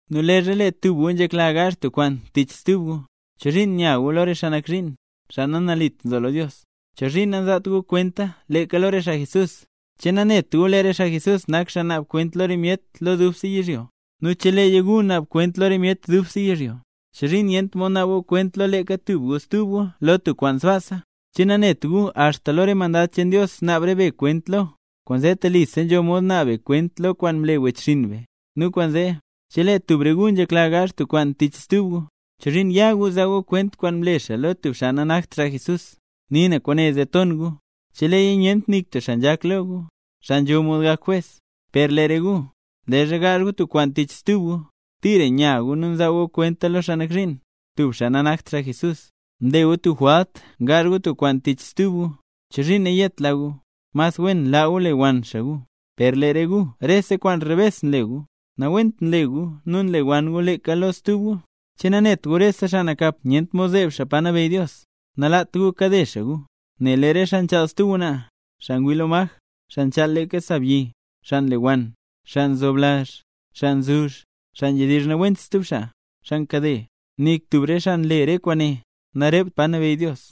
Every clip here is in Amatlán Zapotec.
Nu leezha lee tub re gu nzhekla gaazh tub kwaan tich stub gu, ¿chozhiin nya gu lo re xaa nak zhiin, xaa nanalit nzo lo Dios? ¿Chozhiin nanzaat gu kwenta leeka lo re xaa Jesús, re xaa nambey? ¿Che nanet gu lee re xaa Jesús nak xaa naab kwent lo re myet lo dubse yizhyo? Nu cheleeya gu naab kwent lo re myet dubse yizhyo, ¿chozhiin nyent mod naab gu kwent lo leeka tub gu stub gu lo tub kwaan sbaasa? ¿Che nanet gu axta lo re mandad cheen Dios naab re be kwent lo? ¡Kwaanzee telisa nzho mod naab be kwent lo kwaan mle wechxinn be! Nu kwaanzee, chelee tub re gu nzhekla gaazh tub kwaan tich stub gu, ¿chozhiin ya gu zaa gu kwent kwaan mle xaa lo tub xaa nanakt xaa Jesús? ¡Nii na kwaane zee ton gu! ¿Cheleeya nyent nik tub xaa nzhak lo gu, xaa nzho mod gak jwes? ¡Per lee re gu, leezha gaazh gu tub kwaan tich stub gu, tira nya gu nu nzaa gu kwenta lo xaa nak zhiin, tub xaa nanakt xaa Jesús! Nle gu tub jwalt ngaazh gu tub kwaan tich stub gu. ¿Chozhiin nayetla gu? ¡Mas wen laa gu lewann xaa gu! ¡Per lee re gu rese kwaan rebes nle gu, nawent nle gu nu nlewann gu leeka lo stub gu! ¿Che nanet gu rese xaa nakap nyent mod zeeb pa nabeyy Dios? Nalaat gu kade xaa gu, nel lee re xaa nchaal stub ngwnaa, xaa ngwii lo maj, xaa nchaal leeka sa byi, xaa nlewann, xaa nzoblazh, xaa nzuzh, xaa nzhedizh nawent stub xaa, xaa nkade, nik tub re xaa nle re kwaane, narept pa nabeyy Dios.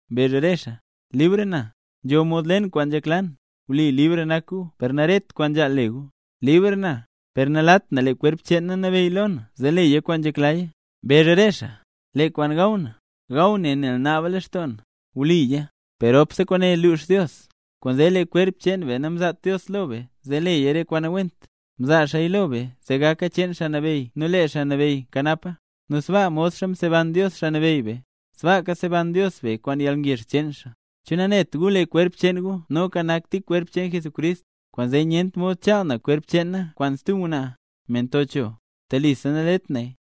Mbezh re xaa: “Libr na, nzho mod le na kwaan nzhekla na”. Wli libr nak gu per naret kwaan nzhaal le gu. Libr na, per nalaat na lee kwerp cheen na nabeyy lo na zee leya kwaan nzheklaya. Mbezh re xaa: “Lee kwaan gaw na, gaw naya nel naaba lextoo na”. Wliya, per ropse kwaane lux Dios. Kwaanzee lee kwerp cheen be namzaat Dios lo be zee leya re kwaan nawent, mzaa xaaya lo be zee gaka cheen Xaa Nabeyy nu lee Xaa Nabeyy nkanapa. Nu sbaa modxa mseban Dios Xaa Nabeyy be, sbaaka seban Dios be kwaan yalngezh cheen xaa. ¿Che nanet gu lee kwerp cheen gu noka nak tik kwerp cheen Jesucrist? Kwaanzee nyent mod chaal na xkwerp na kwaan stub ngwnaa, me nto cho. ¡Telisa nalet naya!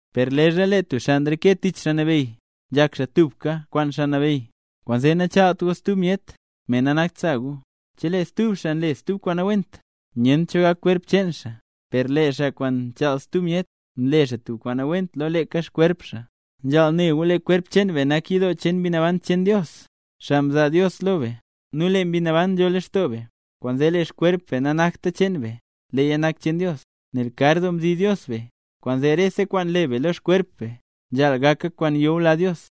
Per leezha lee tub xaa nreke tich Xaa Nabeyy, nzhak xaa tubka kwaan Xaa Nabeyy. Kwaanzee nachaalt gu stub myet, me nanakt sa gu. Chelee tub xaa nle stub kwaan nawent, nyent cho gak kwerp cheen xaa; per lee xaa kwaan nchaal stub myet, nle xaa tub kwaan nawent lo leeka xkwerp xaa. Nzhaal ne gu lee kwerp cheen be nak yidoo cheen Mbi Naban cheen Dios, xaa mzaa Dios lo be, nu lee Mbi Naban nzho lextoo be. Kwaanzee lee xkwerp be nanakta cheen be, leeya nak cheen Dios, nel kar doo mzi Dios be. Kwaanzee rese kwaan le be lo xkwerp be, nzhaal gaka kwaan nyula Dios.